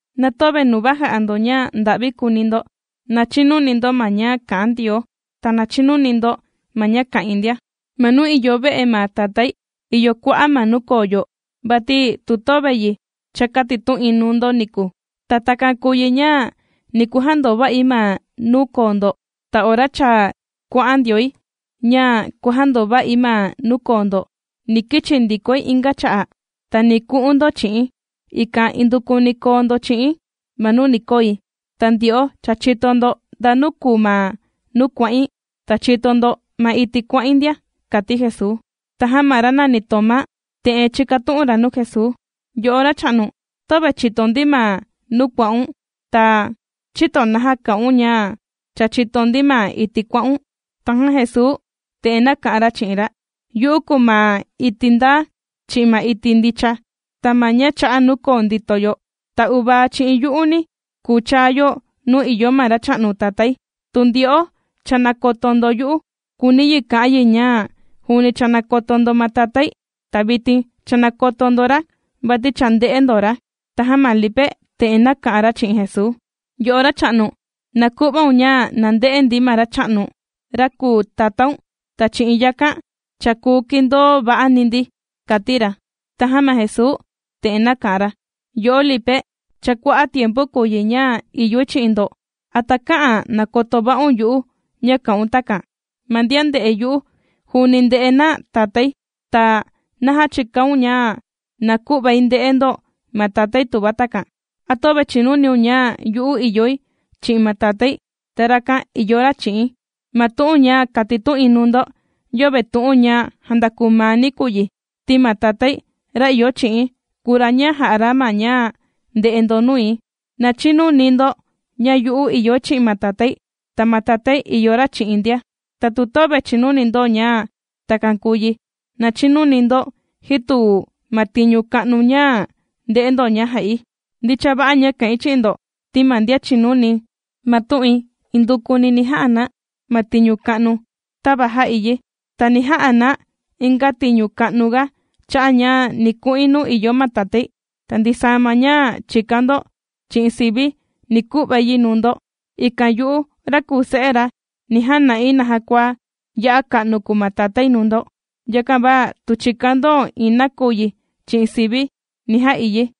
’Na töve nuva jà'a ndo ña nda'vi kūuni ndo. Na chinuni ndo ma ña kà'an Ndioo, ta na chinuni ndo ma ña kà'in ndia. Ma nuu ìyo ve'e ma Tatái, ìyo kua'a' ma nuu koo yo, vati tu töve yi, cha kātitu'in nuu ndo niku. Ta takan kùu yi ña ni kujandova'i ma nuu koo ndo. Ta ora cha kuà'an ndioi ña kuàjandova'i ma nuu koo ndo, ni kichi ndikoi inga cha'a', ta ni ku'un ndo chi'i̱n, ikan indukuni koo ndo chi'i̱n ma nuu ni koi. Ta ndyo'o cha chìto ndo ndanu kùu ma nuu kuà'in, ta chìto ndo ma iti' kuà'in ndia ―kàti Jesuu. Tajan ma ra nàni Tomá te'en chīkatu'un ra nuu Jesuu: ―Yo'o Racha'nu, töve chìto ndi ma nuu kuà'un, ta, ¿chïto naja kà'un ña cha chìto ndi ma iti' kuà'un? Tajan Jesuu te'en nāka'an ra chi'in ra: ―Yu'u kùu ma iti' ndaa, chi'in ma iti' ndicha, ta ma ña chà'a nuu koo ndìto yo. Ta uvaa chi'in yu'uni, kùu chaa yo nuu ìyo ma Racha'nu Tatái. Tu ndyo'o cha nākoto ndo yu'u, kùuni yi ka'an yi ña juuni cha nàkoto ndo ma Tatái, ta vitin cha nàkoto ndo ra, vati cha ndè'e ndo ra. Tajan ma Lipe te'en nāka'an ra chi'in Jesuu: ―Yo'o Racha'nu, na ku'vaun ña na nde'e ndi ma Racha'nu, ra kùu Tatáun, ta chi'in yakan, cha kùu kìndoo va'ani ndi ―kàti ra. Tajan ma Jesuu te'en nāka'an ra: ―Yo'o Lipe, cha kua'a' tiempu kùu yi ña ìyoi chi'in ndo, ¿a takä'an nakoto va'un yu'u ña kà'un takan? Ma ndian ndè'e yu'u, juuni ndè'e na Tatái. Ta, ¿naja chìkaun ña na ku'vai nde'e ndo ma Tatái tuva takan? ¿A töve chìnuniun ña yu'u ìyoi chi'in ma Tatái, ta rakan ìyo ra chi'i̱n? Ma tu'un ña kàtitu'in nuu ndo, yöve tu'un ña jàndakuu maani̱ kùu yi, ti ma Tatái, ra ìyo chi'i̱n, kùu ra ña jà'a ra ma ña ndè'e ndo nui. Na chinuni ndo ña yu'u ìyoi chi'in ma Tatái, ta ma Tatái ìyo ra chi'i̱n ndia. Ta tu töve chìnuni ndo ña takan kùu yi, na chinuni ndo ji tu ma tiñu ka'nu ña ndè'e ndo ña jà'i. Ndicha va'a ña kà'in chi'in ndo ti ma ndian chìnuni ma tu'in, indukuni ni ja'a na ma tiñu ka'nu, tava jà'i yi. Ta ni ja'a na inga tiñu ka'nuga cha'a' ña ni ku'in nuu ìyo ma Tatái. Ta ndisaa ma ña chìkan ndo chi'in sivi̱, ni ku'vai yi nuu ndo, ikan yu'u ra kùu Se'e ra, ni jana'i naja kua ya'a ka'nu kùu ma Tatái nuu ndo. Yakan va tu chìkan ndo iin nakuyi chi'in sivi̱, ni ja'i yi.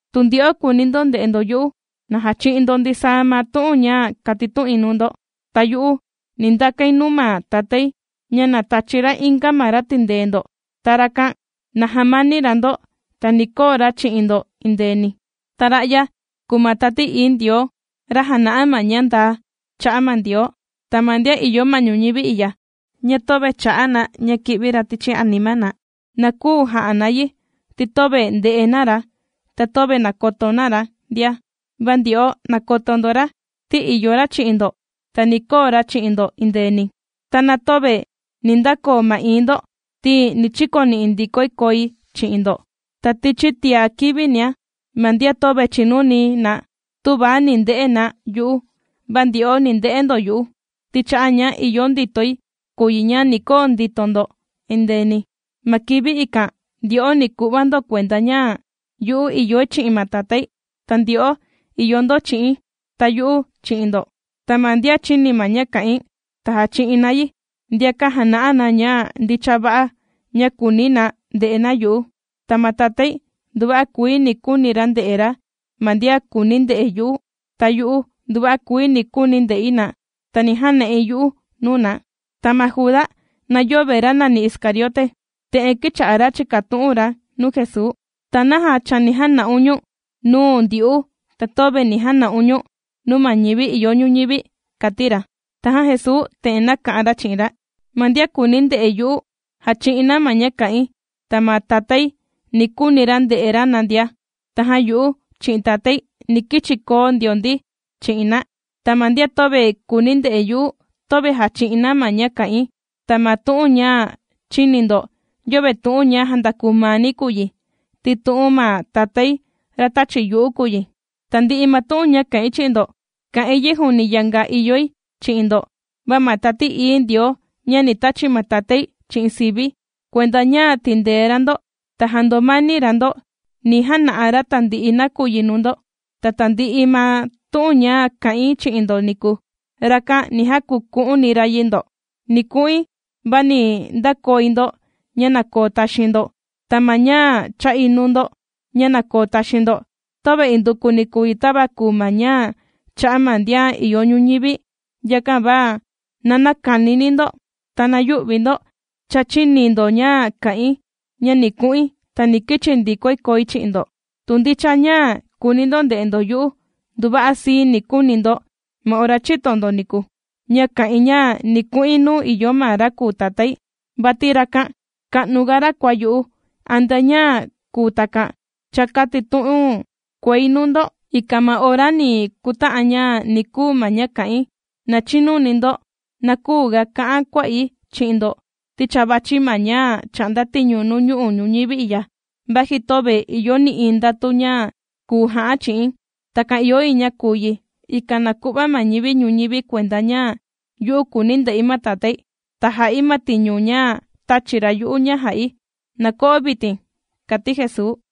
’Tu ndyo'o kùuni ndo nde'e ndo yu'u, na jachi'in ndo ndisaa ma tu'un ña kàtitu'in nuu ndo. Ta yu'u ni ndakain nuu ma Tatái ña na tachi ra inga ma ra tìndee ndo, ta rakan, na jamani ra ndo, ta ni koo ra chi'in ndo endeeni. Ta ra'ya kùu ma Tati Ií Ndioo, ra jàna'a ma ña ndaa cha'a' ma Ndioo. Ta ma ndian ìyo ma ñuñivi i'ya, ña töve chà'a na ña kì'vi ra tichi anima na. Na küu jà'a na yi, ti töve ndè'e na ra, ta töve nàkoto na ra ndia. Va ndyo'o nàkoto ndo ra, ti ìyo ra chi'in ndo, ta ni koo ra chi'in ndo endeeni. Ta na töve ni ndakoo ma'ii̱n ndo, ti ni chikoni'i ndikoi koi chi'in ndo. Ta tichi tia kivinia, ma ndian töve chìnuni na tüva ni nde'e na yu'u; va ndyo'o ni nde'e ndo yu'u, ti cha'a' ña ìyo nditoi kùu yi ña ni koo ndito ndo endeeni. Ma kivi ikan, ndyo'o ni ku'va ndo kuenda, ña yu'u ìyoi chi'in ma Tatái, ta ndyo'o ìyo ndo chi'i̱n, ta yu'u chi'in ndo. Ta ma ndian chìni ma ña kà'in, ta jàchi'in na yi, ndiakan jàna'a na ña ndicha va'a ña kùuni na nde'e na yu'u. Ta ma Tatái nduva'a kuii ni kuuni ra nde'e ra ma ndian kùuni nde'e yu'u, ta yu'u nduva'a kuii ni kuuni̱ nde'i na, ta ni jana'i yu'u nuu na. Ta ma Juda (na yöve ra nàni Iscariote), te'en kīcha'a ra chìkatu'un ra nuu Jesuu: ―¿Ta naja chani jana'un ñu̱n nuu ndyu'u, ta töve ni jana'un ñu̱n nuu ma ñivi ìyo ñuñivi? ―kàti ra. Tajan Jesuu te'en nāka'an ra chi'in ra: ―Ma ndian kùuni nde'e yu'u, jàchi'in na ma ña kà'in, ta ma Tatái ni kuuni ra nde'e ra na ndia. Tajan yu'u chi'in Tatái ni kichi koo ndio ndi chi'in na. Ta ma ndian töve kùuni nde'e yu'u, töve jàchi'in na ma ña kà'in. Ta ma tu'un ña chìni ndo, yöve tu'un ña jàndakuu maani̱ kùu yi, ti tu'un ma Tatái, ra tāchi yu'u kùu yi. ’Tandi'i ma tu'un ña kà'in chi'in ndo, kà'in yi juuni yanga ìyoi chi'in ndo. Va ma Tati Ií Ndioo, ña ni tachi ma Tatái chi'in sivi̱, kuenda ña tìndee ra ndo, ta jàndomani ra ndo, ni jana'a ra tandi'i nakuyi nuu ndo, ta tandi'i ma tu'un ña kā'in chi'in ndo niku, rakan ni jakuku'uni ra yi ndo. ’Ni ku'in, va ni ndakoi ndo ña na koo taxiin ndo. Ta ma ña chà'i nuu ndo ña na koo taxiin ndo, töve indukuni kùu yi, tava kùu ma ña chà'a ma ndian ìyo ñuñivi. Yakan va na näkanini ndo, ta na yü'vi ndo. Cha chīni ndo ña kà'in, ña ni ku'in, ta ni kichi ndikoi koi chi'in ndo. Tu ndicha ña kùuni ndo nde'e ndo yu'u, nduva'a sii ni kuuni ndo ma ora chīto ndo niku, ña kà'in ña ni ku'in nuu ìyo ma ra kùu Tatái, vati rakan ka'nuga ra kua yu'u. Antea ña kùu takan, cha kàtitu'un kuei nuu ndo, ikan ma ora ni kuta'an ña ni kuu ma ña kà'in: na chinuni ndo. Na küuga ka'an kuà'i chi'in ndo, ti cha vàchi ma ñá' chà'nda tiñu nuu ñu'u' ñuñivi i'ya, vaji töve ìyo nï'iin ndatu ña kùu ja'án' chi'i̱n. Takan ìyo yi ña kùu yi, ikan na ku'va ma ñivi ñuñivi kuenda ña yu'u kùuni̱ nde'i ma Tatái, ta jà'i ma tiñu ña tāchi ra yu'u ña jà'i. ¡Na ko'o vitin! ―kàti Jesuu.